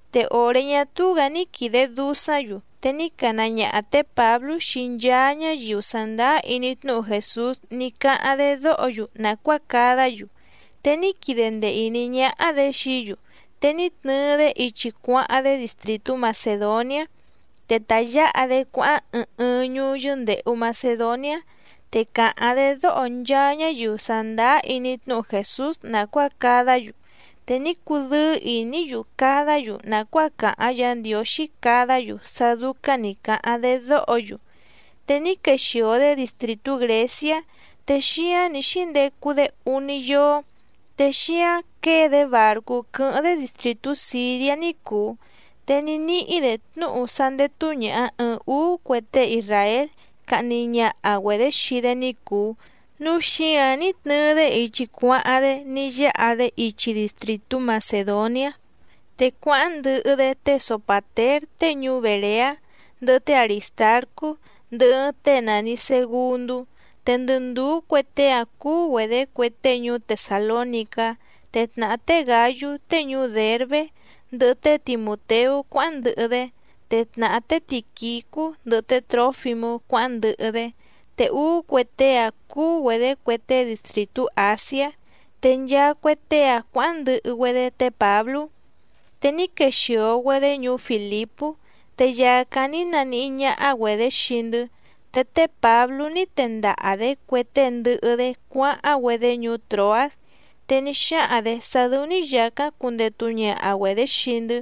Te òré ñá túú‑gǎ ní quìde dusáⁿ‑yu, te ní cana ñaha tě Pǎblú xii nchaa ñáyiu sàndáá iní tnúhu Jèsús ní cáháⁿ‑dé dóho‑yu nàcuáa cadá‑yu. Te ní quide ndee ìní ñáhá‑dě xií‑yu, te ní tnɨɨ‑dé ichi cuáháⁿ‑dé distrìtú Macèdoniá. Te tayǎha‑dé cuáháⁿ ɨɨⁿ ɨɨⁿ ñuú yɨ́ndèhu Macedoniá. Te càháⁿ‑dé dóho nchaa ñáyiu sàndáá iní tnúhu Jèsús nàcuáa cadá‑yu, te ní cudɨ́ɨ́ ìní‑yu cadá‑yu nàcuáa càháⁿ Yǎ Ndiǒxí cadá‑yu sá dúcáⁿ nǐ cáháⁿ‑dé dóho‑yu. Té ní quexìo‑dé distrìtú Grèciá. Te xíáⁿ nǐ xíndecu‑dé úní yóó. Te xíáⁿ quěe‑dé bàrcú quɨ́hɨ́ⁿ‑dé distrìtú Sìriá ní cùu, te ní níhí‑dě tnúhu sá ndétú ñàha ɨɨⁿ úú cue tée isràél cahni ñaha‑güedě xii‑dé ní cùu, núu xíǎⁿ ní tnɨɨ‑dé ichi cuáháⁿ‑dé ní yáha‑dé ichi distrìtú Macèdoniá. Te cuáháⁿ ndɨhɨ‑dé té Sopàtér tée ñuú Bèreá, ndɨhɨ té Arìstarcú, ndɨhɨ ɨɨⁿ tée nàni Segundú. Te ndɨ ndùú cue tée‑áⁿ cúú‑güedě cue tée ñuú Tesàlónicá. Te tnàhá té Gǎyú tée ñuú Dèrbé, ndɨhɨ té Timùteú cuáháⁿ ndɨhɨ‑dé, te tnàhá té Tìquicú ndɨhɨ té Trǒfimú cuáháⁿ ndɨhɨ‑dé, te úú cue tée‑áⁿ cúú‑güedě cue tée distrìtú Àsiá. Te nchaa cue tée‑áⁿ cuǎháⁿ ndɨhɨ‑güedé té Pǎblú. Te ní quexìo‑güedé ñuú Fìlipú, te yàcáⁿ ní naníhí ñáhá‑güedě xii‑ndɨ́. Te té Pǎblú ní tendaha‑dě cue tée ndɨhɨ‑dé cuáháⁿ‑güedé ñuú Tròás, te ní xáhaⁿ‑dě sá dɨ́ú‑ní yàcáⁿ cundetu ñaha‑güedě xii‑ndɨ́.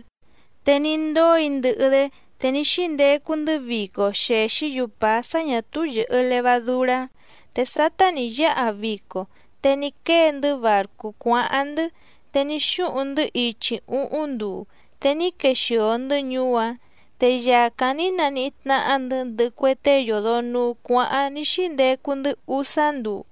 Te ní ndóo‑í ndɨhɨ‑dé, te ní xíndecu‑ndɨ́ vico xèxí‑yu pàá sá ñà túú yɨ̀hɨ levadurá. Te sátá nǐ yáha vico, te ní quée‑ndɨ́ bàrcú cuáháⁿ‑ndɨ́, te ní xúhuⁿ‑ndɨ́ ichi úhúⁿ nduu, te ní quexìo‑ndɨ́ ñuú‑áⁿ. Te yàcáⁿ ní naníhí tnáhá‑ndɨ̌ ndɨhɨ cue tée yòdo nuu cuáháⁿ ní xíndecu‑ndɨ́ úsá nduu.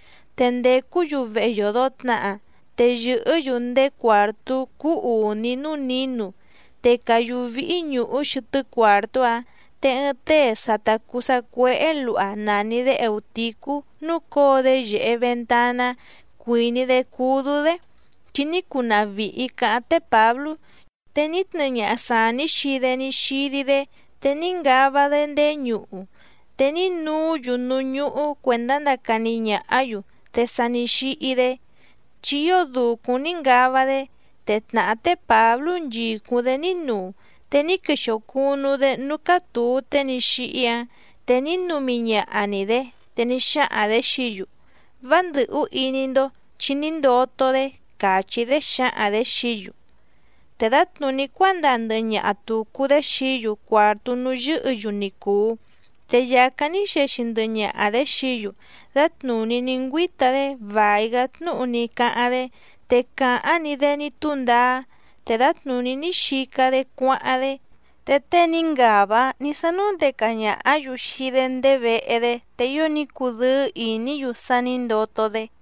Te ndècú‑yu vehe yòdo tnaha, te yɨ̀hɨ́‑yu ndéé cuàrtú cúú ùní núú nǐnu, te càyú víhí ñùhú xɨtɨ́ cuàrtú‑áⁿ. Te ɨɨⁿ tée sa ta cùu sacuéhé luha nàni‑dé Eùticú núcǒo‑dé yèhe ventaná, cuìní‑dé cúdú‑dé, chi ní cunaha vìhi caháⁿ té Pǎblú, te ní tnɨɨ ñaha sàní xii‑dé ní xídí‑dé, te ní ngava‑dé ndéé ñuhu. Te ní nuú‑yu núú ñúhú cuèndá ndacani ñàhá‑yu, te sa ní xíhí‑dé, chi ío dùcúⁿ ní ngava‑dé. Te tnàhá té Pǎblú nchìcúⁿ‑dé ní nuu. Te ní quexìo cunu‑dé núú cátùu tée ní xíhí‑áⁿ, te ní numi ñaha‑ni‑dě, te ní xáhaⁿ‑dě xií‑yu: —Vá ndɨ̀hú iní‑ndó, chi ní ndoto‑dé —càchí‑dé xǎhaⁿ‑dě xií‑yu. Te dǎtnùní cuándaa ndɨhɨ ñaha tùcu‑dé xií‑yu cuàrtú núú yɨ́hɨ̌‑yu ni cùu, te yàcáⁿ ní xexi ndɨhɨ ñaha‑dě xií‑yu, dǎtnùní ní ngüíta‑dé vài‑gá tnúhu ní cáháⁿ‑dé, te càháⁿ‑ni‑dé ní túndaá, te dǎtnùní ní xica‑dé cuáháⁿ‑dé. Te tée ní ngava‑áⁿ ní sánúndeca ñàhá‑yu xii‑dé ndéé vehe‑dé, te ío ní cudɨ́ɨ́ ìní‑yu sá nǐ ndoto‑dé.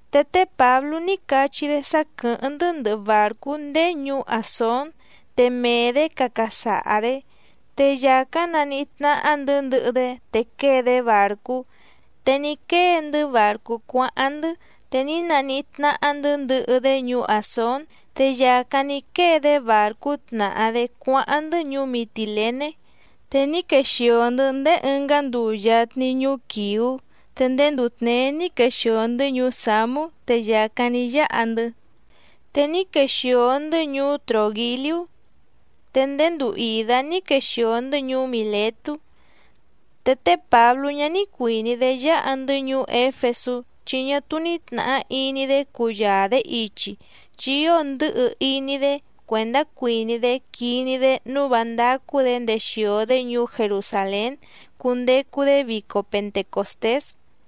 Te té Pǎblú ní cachí‑dé sá quɨ̀hɨ́ⁿ‑ndɨ́ ndɨhɨ bàrcú ndéé ñuú Àsón, te mee‑dě caca saha‑dě, te yàcáⁿ naníhí tnáhá‑ndɨ̌ ndɨhɨ‑dé te quée‑dé bàrcú, te ní quée‑ndɨ́ bàrcú cuáháⁿ‑ndɨ́. Te ní naníhí tnáhá‑ndɨ̌ ndɨhɨ‑dé ñuú Àsón, te yàcáⁿ ní quée‑dé bàrcú tnàhá‑dé cuáháⁿ‑ndɨ́ ñuú Mitìlené. Te ní quexìo‑ndɨ́ ndéé ɨngá nduu yatni ñuú Quɨ̀ú, te ndéé nduu tněé ní quexìo‑ndɨ́ ñuú Sǎmú te yàcáⁿ ní yáha‑ndɨ́, te ní quexìo‑ndɨ́ ñuú Trògiliú. Te ndéé nduu ìdá ní quexìo‑ndɨ́ ñuú Mìletú. Te té Pǎblú ñá ní cuìní‑dé yáha‑ndɨ́ ñuú Éfesú, chi ñá túú ní tnàhá iní‑dé cuyaa‑dě ichi, chi ío ndɨ̌hɨ iní‑dé cuèndá cuìní‑dé quiní‑dé nǔu vá ndácú‑dě ndexìo‑dé ñuú Jerusàlén cundecu‑dé vico Pentecòstés.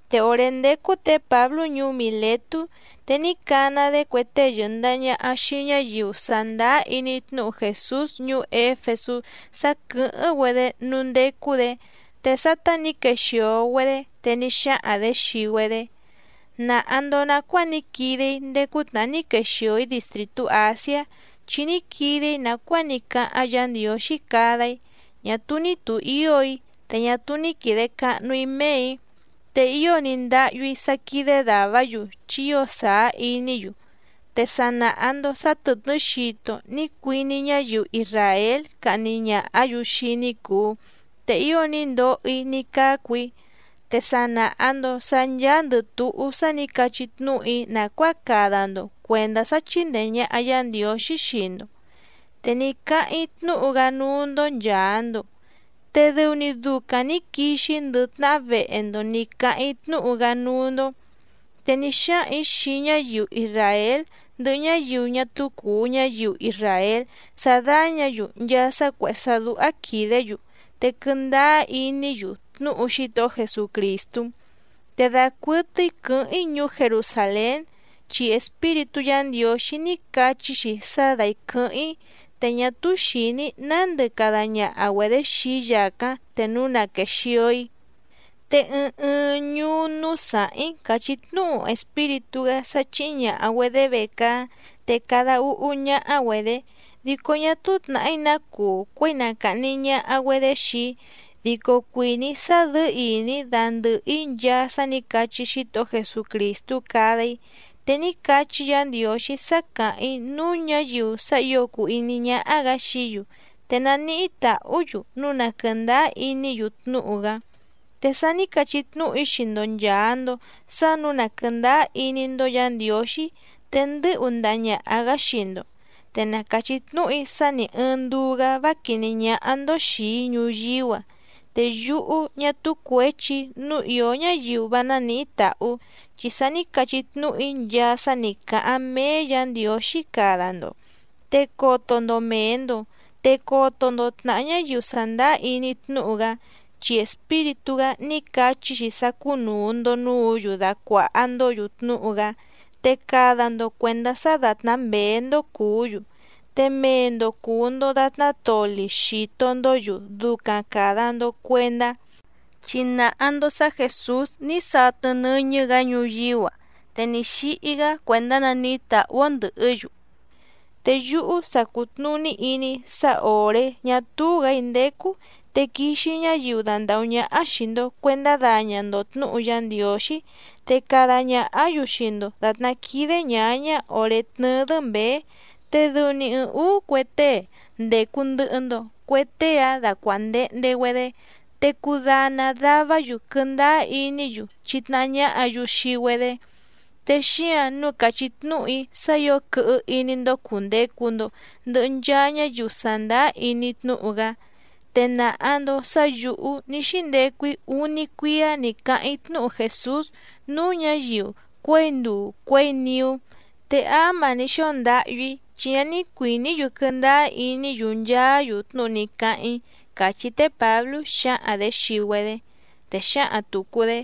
Te òré ndécú tě Pǎblú ñuú Mìletú, te ní cana‑dé cue tée yɨ̀ndaha ñaha xii ñáyiu sàndáá iní tnúhu Jèsús ñuú Éfesú sá quɨ̀hɨ́ⁿ‑güedé núú ndécú‑dě. Te sátá nǐ quexìo‑güedé, te ní xáhaⁿ‑dě xii‑güedé: —Nàha‑ndo nacuáa ní quide‑í ndéé cútnàhá ní quexìo‑í distrìtú Àsiá. Chi ní quide‑í nàcuáa ní cáháⁿ Yǎ Ndiǒxí cada‑í, ñá túú ní tùhío‑í, te ñá túú ní quìde cahnu‑í méè‑í, te ío ní ndáhyú‑í sá quídé dàvá‑yu, chi ío sàá iní‑yu. Te sa nàha‑ndo sá tɨ̀tnɨ́ xito ní cuiní ñáyiu isràél cahni ñàhá‑yu xii‑í ní cùu, te ío ní ndoho‑í ní cácu‑í. Te sa nàha‑ndo sá ncháándɨ̀ túhú sa ní cachí tnúhu‑í nàcuáa cada‑ndo cuèndá sá chíndèe ñaha Yá Ndiǒxí xii‑ndo. Te ní cáháⁿ‑í tnúhu‑gá núú‑ndó nchàa‑ndo, te dɨu‑ni ducaⁿ nǐ quixi‑í ndɨ tnahá vehe‑ndo nǐ cáháⁿ‑í tnúhu‑gá núú‑ndó. Te ní xáhaⁿ‑ǐ xii ñáyiu isràél ndɨhɨ ñáyiu ñá túú cùu ñáyiu isràél sá dáñǎ‑yu nchaa sá cuèhé sá dúhá quìdé‑yu te quɨndáá iní‑yu tnúhu Xítohó Jesucrìstú. Te dacuɨtɨ́í quɨ̌hɨ́ⁿ‑í ñuú Jerusàlén, chi Espíritú Yǎ Ndiǒxí ní cachí‑xi sá dáí quɨ̌hɨ́ⁿ‑í, te ñá túú xìní‑í nándɨ cada ñaha‑güedě xii‑í yàcáⁿ te núu na quèxio‑í. Te ɨɨⁿ ɨɨⁿ ñuú núú sàháⁿ‑í càchí tnúhu Espíritú‑gá sá chíhí ñàha‑güedé vecaá, te cada úhú ñáhá‑güedě. Dico ñá túú tnàhí ná cuu cuěi na càhni ñaha‑güedé xii‑í, dico cuìní‑í sá dɨ̌ɨ́ ìní dandɨ̀hɨ‑í nchaa sá nǐ cachí Xítohó Jesucrìstú cada‑í. Te ní cachí Yǎ Ndiǒxí sá càháⁿ‑í núú ñǎyiu sá ǐo cùu iní ñáhá‑gǎ xií‑yu, te naníhí tàhú‑yu núu na quɨ̀ndáá iní‑yu tnúhu‑gá. ’Te sa ní cachí tnúhu‑í xii‑ndo nchàa‑ndo sá nǔu na quɨ̀ndáá iní‑ndó Yǎ Ndiǒxí, te ndɨ́hu ndaha ñàha‑gá xii‑ndo. Te na càchí tnúhu‑í sá nì ɨɨⁿ nduu‑gá vá quìní ñáhá‑ndó xìi‑í ñuyíú‑a. Te yúhú ñá túú cuěchi‑í nǔu ìó ñáyiu vá nánìhí tàhú, chi sa ní cachí tnúhu‑í nchaa sá nǐ cáháⁿ méé Yǎ Ndiǒxí cada‑ndo. Te coto‑ndo mèe‑ndo, te coto‑ndo tnàhá ñáyiu sàndáá iní tnúhu‑gá, chi Espíritú‑gá ní cachí‑xi sá cúnùu‑ndo núǔ‑yu dacuàha‑ndó‑yu tnúhu‑gá. Te cada‑ndo cuèndá sá dàtná mběé‑ndó cùú‑yu, te mee‑ndo cùu‑ndo datná toli xìto‑ndó‑yu ducaⁿ càda‑ndo cuendá, chi nàha‑ndo sá Jèsús ní satɨ nɨ́ñɨ́‑gǎ, te ní xíhí‑gá cuèndá naníhí tàhú‑ó ndɨ̀hɨ́‑yu. Te yúhú sa cùtnuní iní‑í sá òré ñá túú‑gǎ‑í ndécú, te quixi ñáyiu dandàhú ñáhá xìi‑ndo cuendá daña‑ndo tnǔhu Yá Ndiǒxí, te cada ñàhá‑yu xii‑ndo dàtná quídé ñǎñá òré tnɨ́ɨ́‑dɨ́ mběé. Te dɨu‑ni ɨɨⁿ ǔú cue tée ndècu ndɨhɨ‑ndo, cue tée‑áⁿ dacuàndehnde‑güedé, te cudana davá‑yu quɨndáá iní‑yu chítnáhá ñáhǎ‑yu xii‑güedé. Te xíǎⁿ nǔu càchí tnúhu‑í sá ǐo quɨhɨ iní‑ndó cùndecu‑ndo ndɨhɨ nchaa ñáyiu sàndáá iní tnúhu‑gá. Te nàha‑ndo sá yǔhú ní xíndecu‑í úní cuíá nǐ cáháⁿ‑í tnúhu Jèsús núú ñǎyiu cuěi nduu cuěi niú. Te áma ní xóo ndáhyú‑í, chi ñá ní cuìní‑yu quɨndáá iní‑yu nchaá‑yu tnúhu ní cáháⁿ‑í —càchí té Pǎblú xǎhaⁿ‑dě xii‑güedé. Te xǎhaⁿ tùcu‑dé: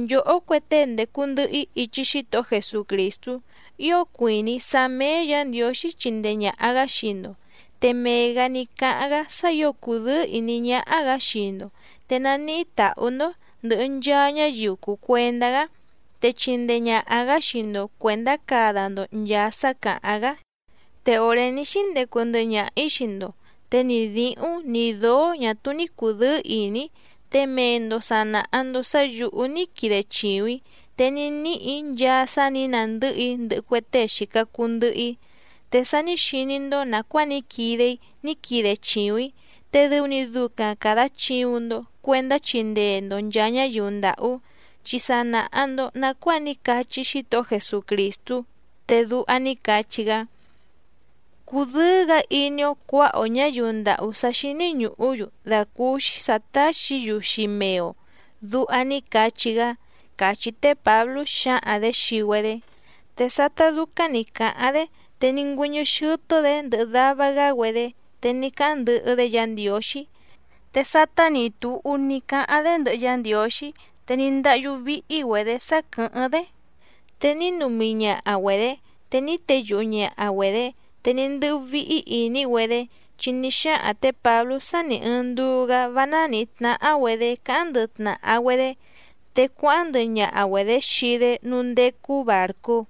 —Nchòhó cue tée ndècu ndɨhɨ‑í ichi Xítohó Jesucrìstú, ío cuìní‑í sá méé Yǎ Ndiǒxí chindee ñàha‑gá xii‑ndo. Te mee‑gǎ ní cáháⁿ‑gá sá ǐo cùdɨ́ɨ́ ìní ñáhá‑gǎ xii‑ndo. Te naníhí tàhú‑ndó ndɨ̀hɨ nchaa ñáyiu cùu cuendá‑gá, te chindee ñàha‑gá xii‑ndo cuèndá cada‑ndo nchàa sá càháⁿ‑gá. Te òré ní xíndecu ndɨhɨ ñaha‑ǐ xii‑ndo, te ni dǐhúⁿ ni dǒó ñà túú ní cùdɨ́ɨ́ ìní‑í. Te mee‑ndo sà naha‑ndo sá yǔhú ní quide chìuⁿ‑í, te ní níhì‑í nchaa sá nǐ nandɨ́hɨ‑í ndɨhɨ cue tée xìca cuu ndɨhɨ‑í. Te sa ní xiní‑ndó nàcuáa ní quide‑í ní quide chìuⁿ‑í, te dɨu‑ni ducaⁿ càda chiuⁿ‑ndo cuendá chindee‑ndo nchàa ñáyiu ndàhú, chi sa nàha‑ndo nacuáa ní cachí Xítohó Jesucrìstú, te duha ní cachí‑gá: “Cùdɨ́ɨ́‑gǎ iní‑ó cuǎha‑o ñǎyiu ndàhú sá xíní ñùhú‑yu dàcúúxí sǎ táxǐ‑yu xii mee‑o”, duha ní cachí‑gá —càchí té Pǎblú xǎhaⁿ‑dě xii‑güedé. Te sátá dúcáⁿ nǐ cáháⁿ‑dé, te ní ngüɨ́ñɨ́ xɨ́tɨ́‑dě ndɨhɨ dava‑gá‑güedé, te ní cáháⁿ ndɨhɨ‑dé Yǎ Ndiǒxí. Te sátá nǐ túhú tnúhu ní cáháⁿ‑dé ndɨhɨ Yá Ndiǒxí, te ní ndáhyú víhí‑güedě sá quɨ̀hɨ́ⁿ‑dé, te ní numi ñaha‑güedě, te ní teyuhu ñàha‑güedé. Te ní ndɨ́hú víhí ìní‑güedé, chi ní xáhaⁿ tě Pǎblú sá nì ɨɨⁿ nduu‑gá vá nánǐhí tnáhá‑güedě cáháⁿ ndɨhɨ tnàha‑güedé. Te cuáháⁿ ndɨhɨ ñaha‑güedě xii‑dé núú ndécú bàrcú.